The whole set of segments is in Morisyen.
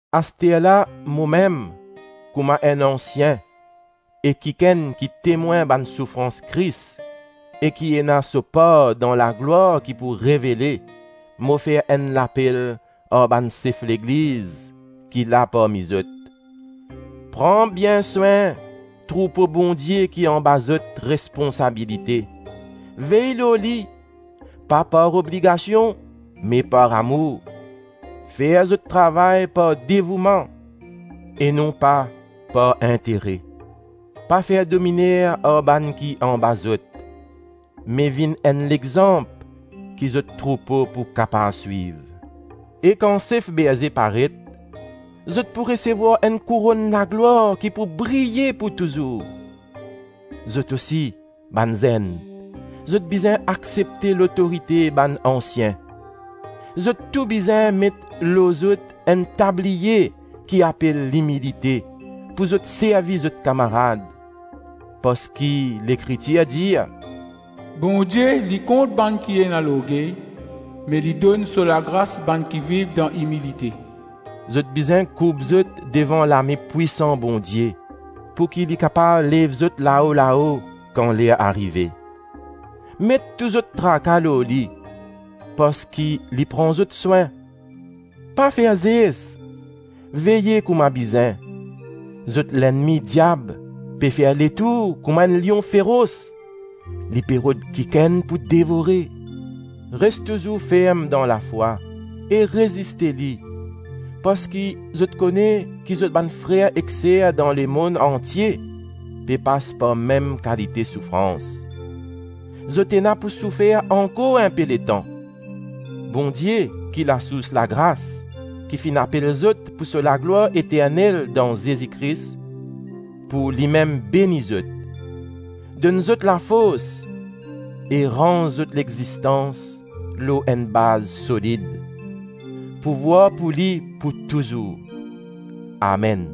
Asterla momem, kouma enn ansien e kikenn ki temwin bann soufrans Kris e ki ena so par dan laglwar ki pou revele, mo fer enn lapel ar bann sef legliz ki la parmi zot: pran bien swin troupo Bondie ki anba zot responsabilite; vey lor li, pa par obligasion me par amour; fer zot travay par devouman e non pa par intere. Pa fer dominer ar bann ki anba zot, me vinn enn lexanp ki zot troupo pou kapav swiv. E kan sef berze paret, zot pou resevwar enn kouronn laglwar ki pou briye pou touzour. Zot osi, bann zenn, zot bizin aksepte lotorite bann ansien. Zot tou bizin met lor zot enn tabliye ki apel limilite pou zot servi zot kamarad, parski Lekritir dir: “Bondie li kont bann ki ena lorgey, me li donn so lagras bann ki viv dan imilite.” Zot bizin kourb zot devan lame pwisan Bondie, pouki li kapav lev zot lao-lao kan ler arive. Met tou zot traka lor li, parski li pran zot swin. Pa fer zes; veye kouma bizin! Zot lennmi diab pe fer letour kouma enn lion feros; li pe rod kikenn pou devore. Res touzour ferm dan lafwa e reziste li, parski zot kone ki zot bann frer ek ser dan lemonn antie pe pas par mem kalite soufrans. Zot ena pou soufer ankor inpe letan. Bondie, ki lasours lagras, ki finn apel zot pou so laglwar eternel dan Zezi Kris, pou limem beni zot, donn zot lafors e ranz zot lexistans lor enn baz solid. Pouvwar pou li pou touzour. Amen.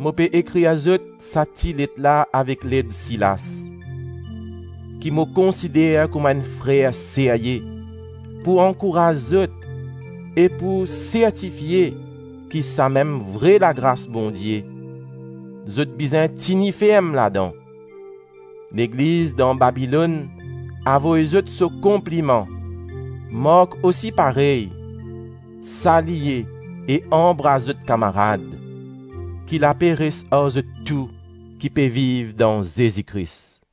Mo pe ekrir zot sa ti let la avek led Silas, ki mo konsider kouma enn frer serye, pou ankouraz zot e pou sertifie ki samem vre lagras Bondie; zot bizin tini ferm ladan. Legliz dan Babilonn avoy zot so konpliman; Mark osi parey. Salye e anbras zot kamarad. Ki lape res ar zot tou ki pe viv dan Zezi Kris.